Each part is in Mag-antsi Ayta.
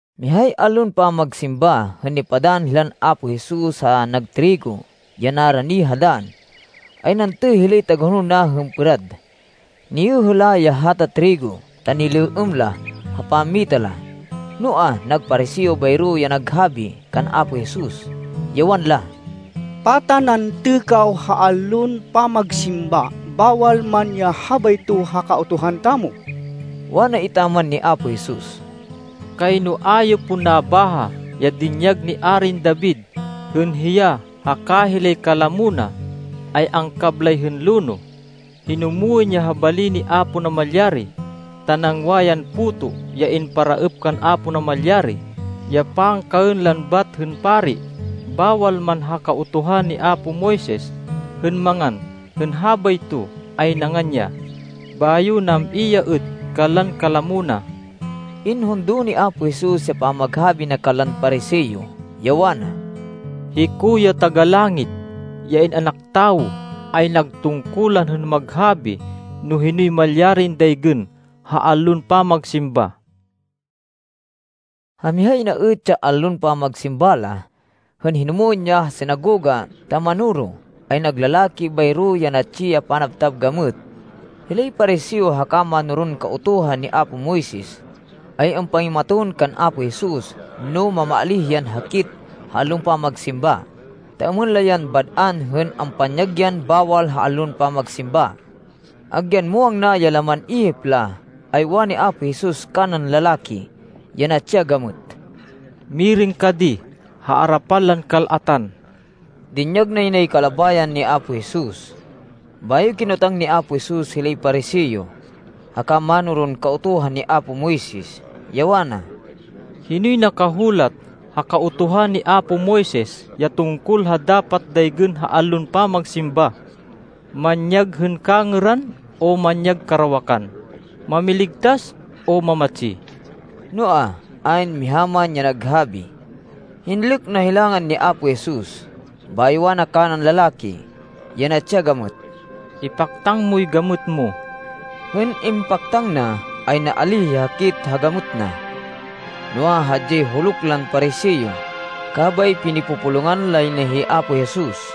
Mihay allon pamagsimba, hên nipadann hilan Apo Jesus ha nag trigo ya narani ha dann, ay nantê hilay tagahonol na hên pêrad. Niyêhê la ya hata trigo ta nilêêm la ha pammita la. Noa, nag Pariseo bayro ya naghabi kan Apo Jesus, ya wanla, “Pata nantê kaw ha allon pamagsimba, bawal man ya habayto ha Kautuhan tamo?” Wana etaman ni Apo Jesus, “Kayno a yo pon nabaha ya dinyag ni Arin David hên hiya haka hilay kalamo na ay angkablay hên lonoh. Hinumwên ya ha bali ni Apo Namalyari, ta nangwa yan puto ya imparaêp kan Apo Namalyari ya pangkaên lan bat hên pari. Bawal man ha Kautuhan ni apo Moises hên mangan hên habayto, ay nangan ya, bayo nam-i ya êt kanlan kalamo na.” Inhundo ni Apo Jesus ya pamaghabi na kanlan Pariseo, ya wana, “Hiko ya Taga-Langit, ya In-anak Tawo, ay nag tungkulan hên maghabi no hinoy malyarin daygên ha allon pamagsimba.” Ha mihay na êt ya allon pamagsimba la, hên hinumwên ya ha sinagoga ta manoro, ay nag lalaki bayro ya natsi ya panabtab gamêt. Hilay Pariseo haka mánoron Kautuhan ni apo Moises, ay ampangimaton kan Apo Jesus, no mamaalíh yan hakit ha allon pamagsimba, ta êmên la yan bad-an hên ampanyag yan bawal ha allon pamagsimba. Agyan muwang na ya laman ihip la, ay wani Apo Jesus kanan lalaki ya natsi ya gamêt, “Mirêng ka di ha arapan lan kal-atan.” Dinyag nay kalabayan ni Apo Jesus. Bayo kinotang ni Apo Jesus, hilay Pariseo haka mánoron Kautuhan ni apo Moises, ya wana, “Hinoy nakahulat ha Kautuhan ni apo Moises ya tungkol ha dapat daygên ha allon pamagsimba? Manyag hên kangêran o manyag karawakan? Mamiligtas o mamatsi?” Noa, ayn miha man ya naghabi. Hinlêk na hilangan ni Apo Jesus. Bayo wana kanan lalaki ya natsi ya gamêt, “Ipaktang moy gamêt mo.” Hên impaktang na, ay naalíh ya hakit ha gamêt na. Noa, hadyay huluk lan Pariseo, kabay pinipupulungan lay na hi Apo Jesus.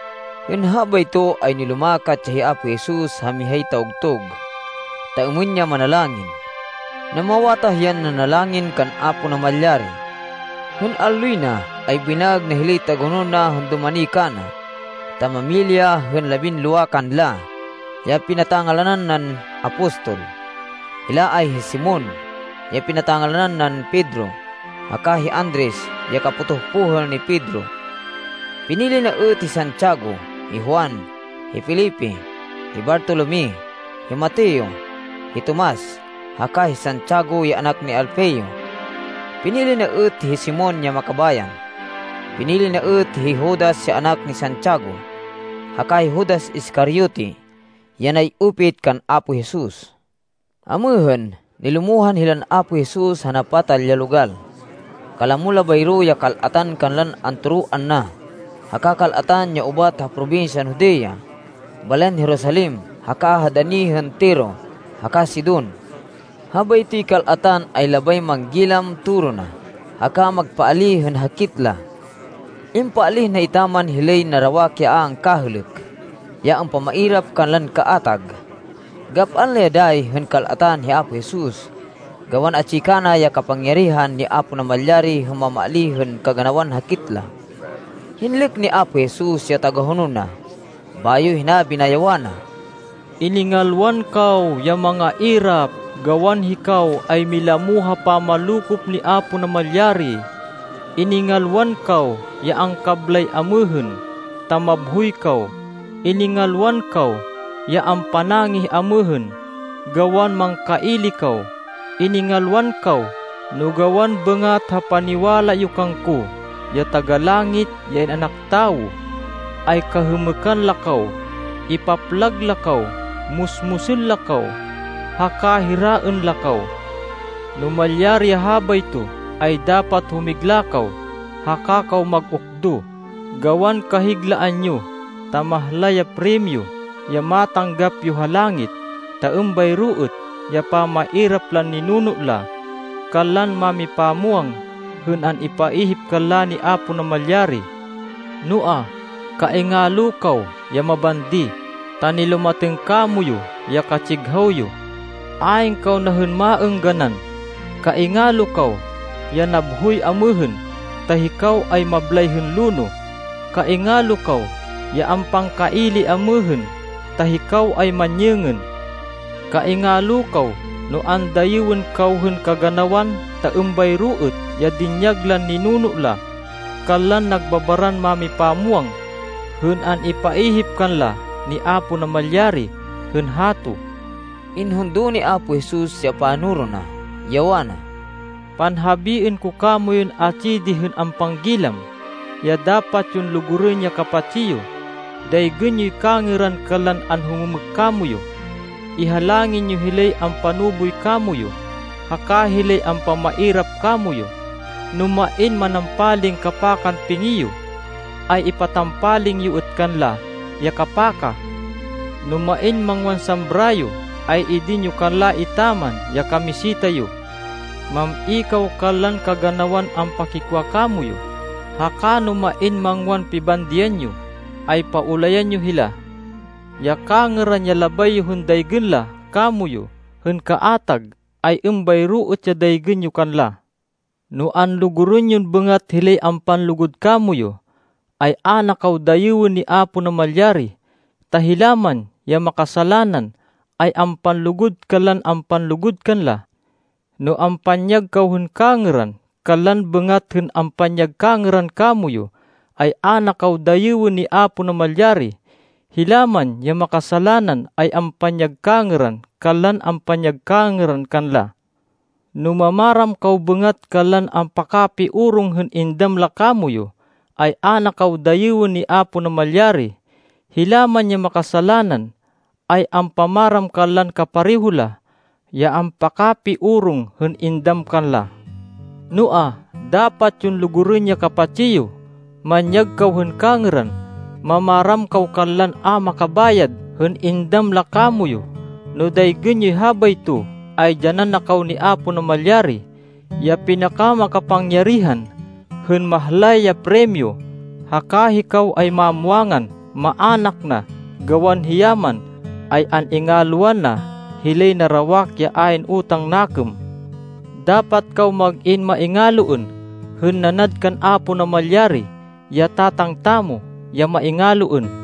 Hên habayto, ay nilumakat ya hi Apo Jesus ha mihay tawgtug, ta êmên ya manalangin. Namawatah yan nanalangin kan Apo Namalyari. Hên alloy na, ay binaêg na hilay tagahonol na hên dumani kana, ta mamili ya hên labinlowa kanla ya pinata-ngalanan nan apostol. Hila ay hi Simon, ya pinata-ngalanan nan Pedro, haka hi Andres ya kapotoh pohêl ni Pedro. Pinili na êt hi Santiago, hi Juan, hi Felipe, hi Bartolome, hi Mateo, hi Tomas, haka hi Santiago ya anak ni Alfeo. Pinili na êt hi Simon ya Makabayan. Pinili na êt hi Judas ya anak ni Santiago haka hi Judas Iscariote ya nay-upit kan Apo Jesus. Amêhên, nilumohan hilan Apo Jesus ha napatal ya logal. Kalamo la bayro ya kal-atan kanlan antoroan na haka kal-atan ya ubat ha probinsyan Judea, balayan Jerusalem, haka ha dani hên Tiro haka Sidon. Habaytoy kal-atan ay labay manggilam toro na, haka magpaalíh hên hakit la. Impaalíh na etaman hilay narawak ya a angkahêlêk, ya ampamairap kanlan kaatag. Gap-an la ya dayi hên kal-atan hi Apo Jesus, gawan atsi kana ya kapangyarihan ni Apo Namalyari hên mamaalíh hên kaganawan hakit la. Hinlêk ni Apo Jesus ya tagahonol na, bayo hinabi na, ya wana, “Iningalwan kaw ya mangairap, gawan hikaw ay milamo ha pamanlokop ni Apo Namalyari. Iningalwan kaw ya angkablay amêhên, ta mabhoy kaw. Iningalwan kaw ya ampanangih amêhên, gawan mangkaili kaw. Iningalwan kaw no gawan bêngat ha paniwala yo kangko ya Taga-Langit, ya In-anak Tawo, ay kahêmêkan la kaw, ipaplag la kaw, musmusên la kaw, haka hiraên la kaw. No malyari ya habayto, ay dapat humigla kaw, haka kaw mag-ukdo gawan kahiglaan yo, ta mahlay ya primyo ya matanggap yo ha langit. Ta êmbayro êt ya pamairap lan ninuno la kanlan mámipamwang hên an-ipaihip kanla ni Apo Namalyari. “Noa, kaingalo kaw ya mabandi ta nilumatêng kamoyu ya katsighaw yo! Ayn kaw na hên maêngganan! Kaingalo kaw ya nabhoy amêhên ta hikaw ay mablay hên lonoh. Kaingalo kaw ya ampangkaili amêhên ta hikaw ay manyêngên. Kaingalo kaw no andayêwên kaw hên kaganawan ta êmbayro êt ya dinyag lan ninuno la kanlan nagbabaran mámipamwang hên an-ipaihip kanla ni Apo Namalyari hên hato.” Inhundo ni Apo Jesus ya panoro na, ya wana, “Panhabiên ko kamoyun atsi di hên ampanggilam, ya dapat yon lugurên ya kapatsi yo. Daygên yoy kangêran kanlan anhumêmêk kamoyu. Ihalangin yo hilay ampanuboy kamoyu, haka hilay ampamairap kamoyu. No main manampaling kapakan pingi yo ay ipatampaling yo êt kanla ya kapaka. No main mangwan sambra yo, ay idin yo kanla etaman ya kamiseta yo. Mam-i kaw kanlan kaganawan ampakikwa kamoyu, haka no main mangwan pibandian yo, ay paulayan yo hila. Ya kangêran ya labay yo hên daygên la kamoyu hên kaatag, ay êmbayro êt ya daygên yo kanla. “No anlugurên yon bêngat hilay ampanlugud kamoyu, ay a na kaw dayêwên ni Apo Namalyari. Ta hila man ya makasalanan ay ampanlugud kanlan ampanlugud kanla. No ampanyag kaw hên kangêran kanlan bêngat hên ampanyag kangêran kamoyu, ay a na kaw dayêwên ni Apo Namalyari. Hila man ya makasalanan ay ampanyag kangêran kanlan ampanyag kangêran kanla. No mamaram kaw bêngat kanlan ampakapiorong hên indam la kamoyu, ay a na kaw dayêwên ni Apo Namalyari. Hila man ya makasalanan ay ampamaram kanlan kapareho la, ya ampakapiorong hên indam kanla. Noa, dapat yon lugurên ya kapatsi yo. Manyag kaw hên kangêran. Mamaram kaw kanlan a makabayad hên indam la kamoyu. No daygên yoy habayto ay dyanan na kaw ni Apo Namalyari, ya pinakamakapangyarihan, hên mahlay ya primyo, haka hikaw ay mamwangan maának na gawan hiya man ay an-ingalwan na hilay narawak ya ayn utang nakêm. Dapat kaw mag-in maingaloên hên nanad kan Apo Namalyari ya Tatang tamo ya maingaloên.”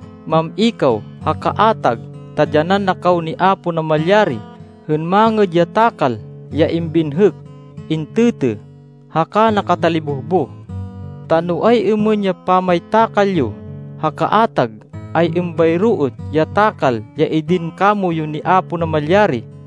Mam-i kaw ha kaatag ta dyanan na kaw ni Apo Namalyari hên mangêd ya takal ya imbinhêk, intêtê, haka nakatalibohboh. Ta no ay-êmên ya pamaytakal yo ha kaatag, ay êmbayro êt ya takal ya idin kamoyu ni Apo Namalyari.”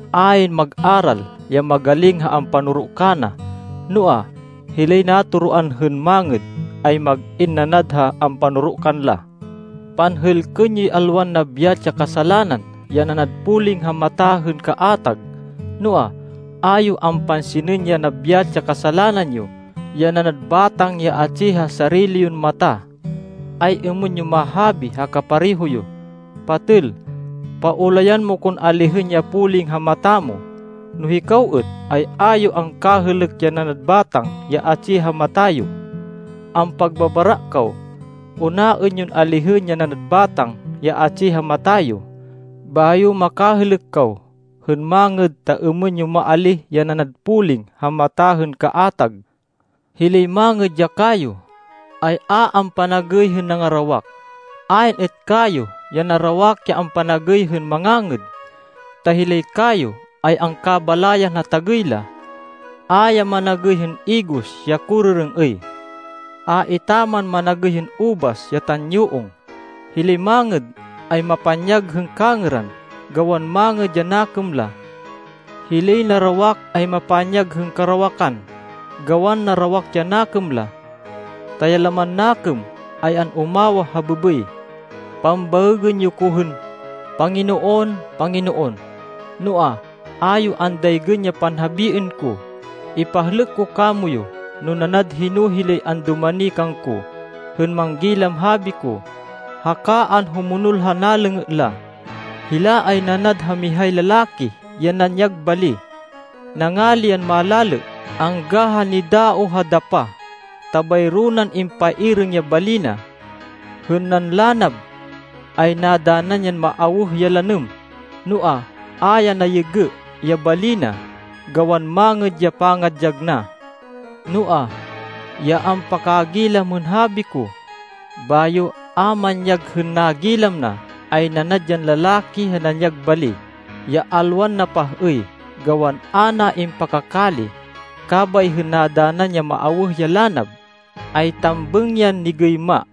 Ayn mag-aral ya magaling ha ampanoro kana. Noa, hilay natoroan hên mangêd ay mag-in nanad ha ampanoro kanla. “Panhêlkên yoy alwan nabyat ya kasalanan ya nanad poling ha mata hên kaatag, noa, a yo ampansinên ya nabyat ya kasalanan yo ya nanad batang ya atsi ha sarili yon mata. Ay-êmên yon mahabi ha kapareho yo, ‘Patêl, paulayan mo kon alihên ya poling ha mata mo,’ no hikaw êt, ay a yo angkahêlêk ya nanad batang ya atsi ha mata yo. Ampagbabara kaw! Unaên yon alihên ya nanad batang ya atsi ha mata yo, bayo makahêlêk kaw hên mangêd, ta êmên yo maalíh ya nanad poling ha mata hên kaatag.” “Hilay mangêd ya kayo, ay a ampanagêy hên nangarawak. Ayn êt kayo ya narawak ya ampanagêy hên mangangêd. Ta hilay kayo ay angkabalayan ha tagêy la. A ya managêy hên igos ya korêrêng-êy. A etaman managêy hên ubas ya tanyuong. Hilay mangêd, ay mapanyag hên kangêran, gawan mangêd ya nakêm la. Hilay narawak, ay mapanyag hên karawakan, gawan narawak ya nakêm la. Ta ya laman nakêm ay an-umawah ha bêbêy.” “Pambaêgên yo ko hên ‘Panginoon, Panginoon,’ noa, a yo andaygên ya panhabiên ko. Ipahlêk ko kamoyu no nanad hino hilay andumani kangko hên manggilam habi ko, haka anhumonol ha nalêngê la. Hila ay nanad ha mihay lalaki ya nanyag bali. Nangali yan malalê angga ha nidaoh ha dapah, ta bayro nan impairêng ya bali na. Hên nanlanab, ay nadanan yan maawêh ya lanêm, noa, a ya nayêgê ya bali na gawan mangêd ya pangadyag na. Noa, ya ampakagilam hên habi ko, bayo a manyag hên nagilam na, ay nanad yan lalaki ya nanyag bali ya alwan napah-êy gawan a na impakakali. Kabay hên nadanan yan maawêh ya lanab, ay tambêng yan nigêyma.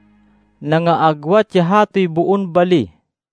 Nangaagwat ya hatoy boon bali.”